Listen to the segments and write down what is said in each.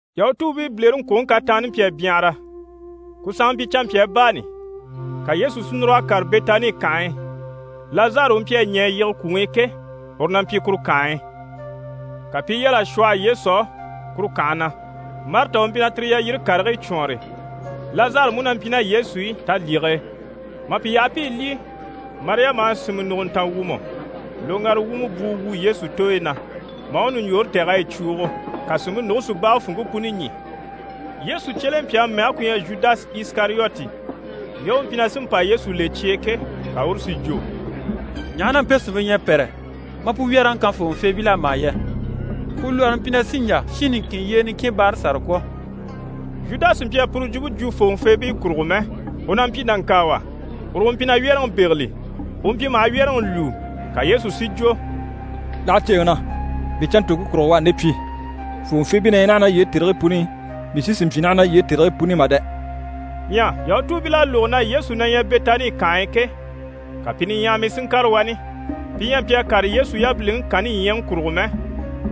Yahutuubiibilereŋkwoŋi kataanni mpyi a byanhara, ku sanŋa mpyi canmpyaa baani. Ka Yesu si núr'a kàre Bɛtani kànhe e. Lazari u mpyi a ɲɛ̀ a yige kwùŋi i ke, uru na mpyi kuru kànhe e. Ka pi i yal'a shwɔhɔ Yesu á kuru kànhe na, Marita u mpyi na tire yalyire karigii cwɔɔnre. Lazari mú na mpyi ná Yesu i talyige e. Mà pi yaha pi i lyî, Mariyama à sìnmɛ nùguntan wumɔ loŋgara wumɔ bwuu wu Yesu tooyi na, maa u ɲùɲjoore tɛ̀g'a yi cwuugo. Ka sìnmpe nùge si bage funŋke puni ɲî. Yesu cyelempyaŋi mɛge ku ɲyɛ Zhudasi Isikariyoti, ŋge u mpyi na sí n‑pa Yesu le cye e ke, ka uru si jwo: «Ɲaha na mpe sìnmpe ɲyɛ a pɛ́rɛ maa pu wyɛ́rɛŋi kan fòŋɔfeebil'á mà yɛ? Pu lwɔɔre mpyi na sí n‑jà shin niŋkin yyee niŋkin báara sàra kwɔ̀.» Zhudasi mpyi a puru jwumpe jwo fòŋɔfeebii kurugo mɛ, u na mpyi nàŋkaawa, uru u mpyi na wyɛ́rɛŋi bégeli, u mpyi maha wyɛ́rɛŋi lwúu. Ka Yesu si jwo: «Láha ceeŋi na! Mii canntoŋke kurugo u à nde pyi. Fòŋɔfeebii ɲyɛ naha ná yii e tèrigii puni i, mii sí sì n‑pyi ná yii e tèrigii puni i mà dɛ!» Ɲyɛ Yahutuubil'à lógo na Yesu na ɲyɛ Bɛtani kànhe e ke, ka pi niɲyahamii si ŋkàre wani. Pi ɲyɛ a mpyi a kàre Yesu yabiliŋi kanni ɲyaŋi kurugo mɛ,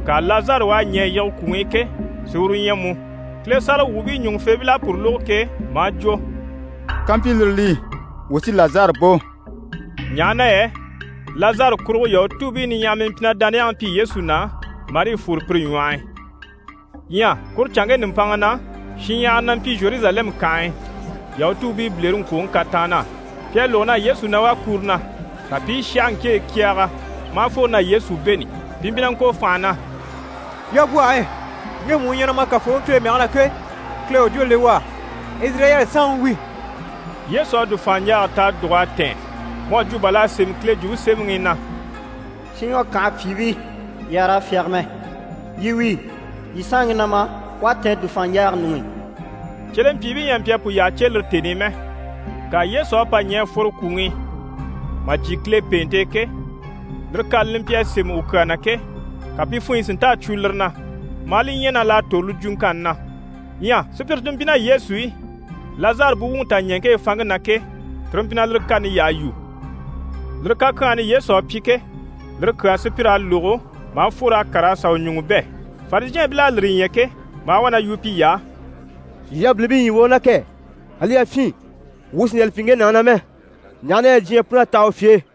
ŋka Lazari u à ɲɛ̀ a yige kwùŋi i ke, si uru ɲya mú. Kile sáragawwuubii ɲùŋufeebil'à puru lógo ke, maa jwo: «Kampyi lire li, wuu sí Lazari bò» ɲaha na yɛ Lazari kurugo Yahutuubii niɲyahamii mpyi na dániyaŋi pyi Yesu na, marii fwore pire ɲwɔh'i. Ɲyɛ kuru canŋke nùmpanŋa na, shinɲyahara na mpyi Zheruzalɛmu kànhe e Yahutuubii bilereŋkwoŋi kataann'á, pi à lógo na Yesu na wá kuro na. Ka pi i sháhaŋkeɲyi kyɛɛgɛ maa fworo na Yesu bêni. Pi mpyi na ŋko fànha na: «Yabwɔhe! Ŋgemu u ɲyɛ na ma Kafooŋi Kile mɛge na ke, Kile u jwó le u á! Izirayɛli saanŋi wi.» Yesu à dùfaanɲjaaga ta a dùg'a tɛ̀ɛn, mu à jwo bà l'à sémɛ Kile Jwumpe Semɛŋi i na: «Siyɔn kànhe pyìibii, yii àha raa fyáge mɛ! Yii wíi, yii saanŋi na ma, u à tɛ̀ɛn dùfaanɲjaaga ɲuŋ'i.» Cyelempyiibii ɲyɛ a mpyi a pu yyaha cè lire tèni i mɛ, ŋka Yesu à pa ɲɛ̀ a fworo kwùŋi i, mà jyè Kile pèente e ke, lire kani li mpyi a sémɛ u kyaa na ke, ka pi funɲyi si nta a cwo lire na, maa li ɲya na l'à tòro li jwuŋkanni na. Ɲyɛ sùpyire ti mpyi ná Yesu i, Lazari buwuŋi taɲɛŋke e fanŋke na ke, tire mpyi na lire kani yyaha yu. Lire kakyanhani Yesu à pyi ke, lire kyaa sùpyir'à lógo maa fwor'a kàr'a sà u ɲùŋɔ bɛ̂. Farizhɛɛnbil'à lire ɲya ke, maa wá na yu piy'á: «Yii yabilimpii ɲyii wà u na kɛ! Ali yafyin, wuu sì n‑jà li pyi ŋge nàŋi na mɛ, ɲaha na yɛ diɲyɛ pun'à taha u fye e.»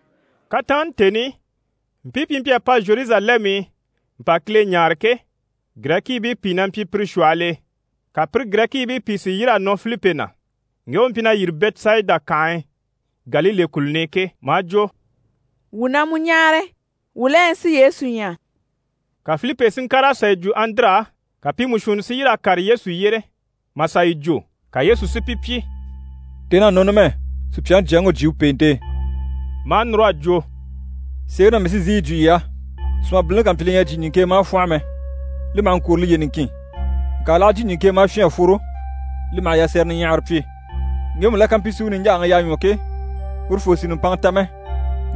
Kataanni tèni i, mpii pi mpyi a pa Zheruzalɛmu i mpa Kile ɲáare ke, Girɛkiibii pìi na mpyi pire shwɔhɔl'e. Ka pire Girɛkiibii pìi sí yîr'a nɔ Filipi na, ŋge u mpyi na yîri Bɛtisayida kànhe e, Galile kùluni i ke, maa jwo: «Wuu na mu ɲáare, wuu la ɲyɛ si Yesu ɲya.» Ka Filipi si ŋkàr'a sà yi jwo Andire á, ka pi mú shuunni si yîr'a kàre Yesu yyére, mà sà yi jwo. Ka Yesu si pi pyi: «Tèn'à nɔ numɛ, Supyaŋi Jyaŋi u jyè u pèente e.» Maa núr'a jwo: «Sèeŋi na mii sí n‑sìi yi jwo yii á, sùmabilini ká mpyi li ɲyɛ a jyè ɲìŋke e maa fwɔ́nhɔ mɛ, li maha ŋkwôro liye niŋkin, ŋka l'aha jyè ɲìŋke e maa fyîn a fworo, li maha yasɛrɛ niɲyahara pyi. Ŋgemu la ká mpyi si u niɲjaaŋi yaa ɲwɔ ke, urufoo sì nùmpanŋa ta mɛ,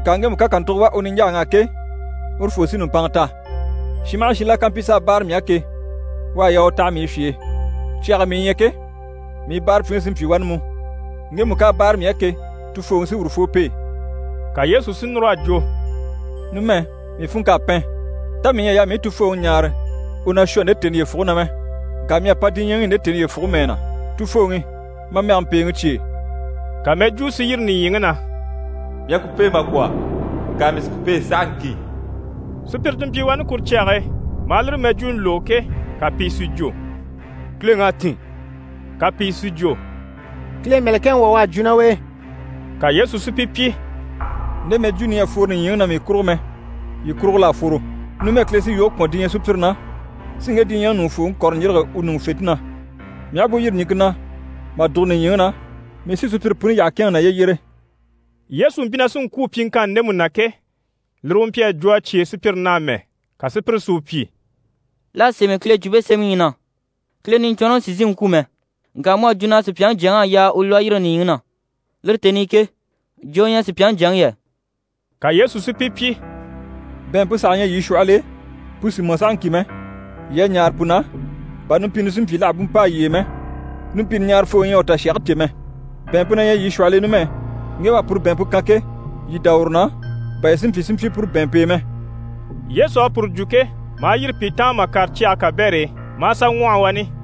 ŋka ŋgemu ká kàntugo wà u niɲjaaŋ'á ke, urufoo sí nùmpanŋa ta. Shin maha shin la ká mpyi s'a báare mii á ke, u à yaa u taha mii fye e. Cyage e mii ɲyɛ ke, mii báarapyiŋi sí n‑pyi wani mú. Ŋgemu ká a báare mii á ke, Tufooŋi sí urufoo pêe.» Ka Yesu si núr'a jwo: «Numɛ, mii funŋk'à pɛn, tá mii ɲyɛ a yaa mii u Tufooŋi ɲáare u na shwɔ nde tèni yyefuge na mɛ? Ŋka mii à pa diɲyɛŋi i nde tèni yyefuge mɛɛ na. Tufooŋi, ma mɛge mpèeŋi cyêe.» Ka mɛjwuu si yîri nìɲyiŋi na: «Mii à ku pêe mà kwɔ̀, ŋka mii sí ku pêe sahaŋki.» Sùpyire ti mpyi wani kuru cyage e, maa lire mɛjwuuni lógo ke, ka pìi si jwo: «Kileŋ'à tîn.» Ka pìi si jwo: «Kile mɛ̀lɛkɛŋi wà u à jwo ná u e.» Ka Yesu si pi pyi: «Nde mɛjwuuni ɲyɛ a fworo nìɲyiŋi na mii kurugo mɛ, yii kurugo l'à fworo. Numɛ Kile sí yoge kwɔ̀n diɲyɛ sùpyire na, si ŋge diɲyɛŋi ɲùŋufooŋi kɔ̀rɔ ɲjîrige u ɲùŋufente na. Mii aha bú yîri ɲìŋke na mà dùgo nìɲyiŋi na, mii sí sùpyire puni yyaha kɛ̂ɛnŋɛ naye yyére.» Yesu mpyi na sí n‑kwû pyiŋkanni ndemu na ke, lire u mpyi a jwo a cyêe sùpyire na amɛ. Ka sùpyire si u pyi: «L'à sémɛ Kile Jwumpe Semɛŋi i na “Kile Niɲcwɔnrɔŋi sì n‑sìi n‑kwû mɛ.” Ŋka mu à jwo na Supyaŋi Jyaŋi à yaa u lwɔ́ a yîrige nìɲyiŋi na. Lire tèni i ke, jo u ɲyɛ Supyaŋi Jyaŋi yɛ?» Ka Yesu si pi pyi: «Bɛ̀ɛnmpe saha ɲyɛ yii shwɔhɔl'e, pu sì mɔ sahaŋki mɛ, yii a ɲaare pu na, bà numpini si mpyi l'àha bú mpâa yii e mɛ, numpini ɲaarafooŋi ɲyɛ a u tashage cè mɛ. Bɛ̀ɛnmpe na ɲyɛ yii shwɔhɔl'e numɛ, ŋge u à puru bɛ̀ɛnmpe kan ke, yii dá uru na, bà yii si mpyi si mpyi puru bɛ̀ɛnmpe e mɛ.» Yesu à puru jwo ke, maa yîri pi taan ma kàre cyage kabɛr'e, maa sà ŋwɔhɔ wani.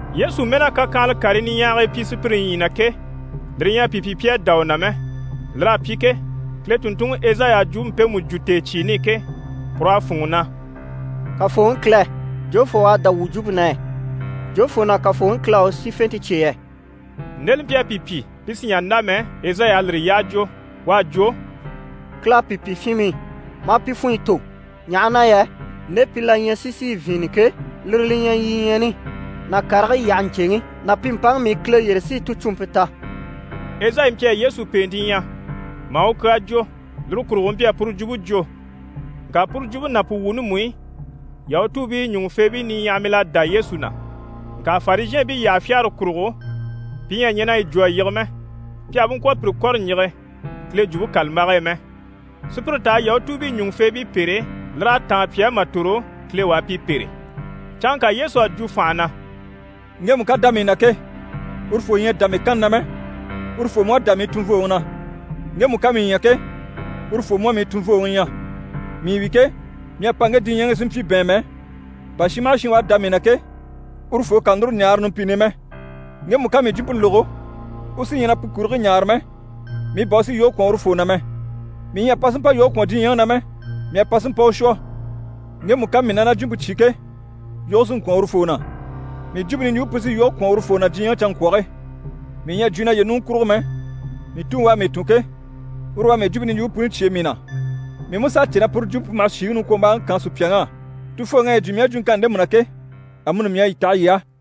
Yesu mɛ́n'à kakyanhala karii niɲyahagii pyi sùpyire ɲyii na ke, lire ɲyɛ a pi pyi pi à dá u na mɛ. Lir'à pyi ke, Kile tùnntunŋi Ezayi à jwumpe mpemu jwo tèecyiini i ke, pur'à fûnŋɔ na: «Kafooŋi Kile, jofoo u à dá wuu jwumpe na yɛ? Jofoo na Kafooŋi Kile à u sífente cyêe yɛ?» Nde li mpyi a pi pyi pi sì n‑jà n‑dá mɛ, Ezayi à lire yyaha jwo. U à jwo: «Kile à pi pyi fyinmii, maa pi funɲyi tò, ɲaha na yɛ nde pi la ɲyɛ si zìi vyìinnɛ ke, lire li ɲyɛ ɲyiɲyaani ná karigii yyahe ɲcèŋi ná pi mpaŋi mii Kile yyére si ticuumpe ta.» Ezayi mpyi a Yesu pèente ɲya, maa u kyaa jwo, lire kurugo u mpyi a puru jwumpe jwo. Ŋka puru jwumpe ná pu wuuni mú i, Yahutuubii ɲùŋufeebii niɲyahamil'à dá Yesu na, ŋka Farizhɛɛnbii yyaha fyagare kurugo, pi ɲyɛ a ɲɛn'a yi jwo a yige mɛ, pi àha bú ŋkwɔ̀ pi kɔ̀re ɲjige Kile Jwumpe kàlambage e mɛ. Sùpyire t'a Yahutuubii ɲùŋufeebii pêre, lir'à táan pi á mà tòro Kile u a pi pêre. Canŋka Yesu à jwo fànha na: «Ŋgemu ká dá mii na ke, urufoo ɲyɛ a dá mii kanni na mɛ, urufoo mú à dá mii tunvooŋi na. Ŋgemu ká mii ɲya ke, urufoo mú à mii tunvooŋi ɲya. Mii wi ke, mii à pa ŋge diɲyɛŋi i si mpyi bɛ̀ɛnmɛ, bà shin maha shin u à dá mii na ke, urufoo kà núru ɲaare numpini i mɛ. Ŋgemu ká mii jwumpe lógo, u sí ɲyɛ na pu kurigii ɲaare mɛ, mii bà u sí yoge kwɔ̀n urufoo na mɛ. Mii ɲyɛ a pa si mpa yoge kwɔ̀n diɲyɛŋi na mɛ, mii à pa si mpa u shwɔ. Ŋgemu ká mii ná na jwumpe cyé ke, yoge sí n‑kwɔ̀n urufoo na. Mii jwumpe niɲjwumpe pu sí yoge kwɔ̀n urufoo na diɲyɛŋi canŋkwɔge. Mii ɲyɛ a jwo naye ɲùŋɔ kurugo mɛ, mii Tuŋi u à mii tun ke, uru u à mii jwumpe niɲjwumpe puni cyêe mii na. Mii mú s'à cè na puru jwumpe pu maha shìŋi niŋkwombaaŋi kaan sùpyaŋ'á. Tufooŋi à yi jwo mii á jwuŋkanni ndemu na ke, amuni mii à yi taha yii á.»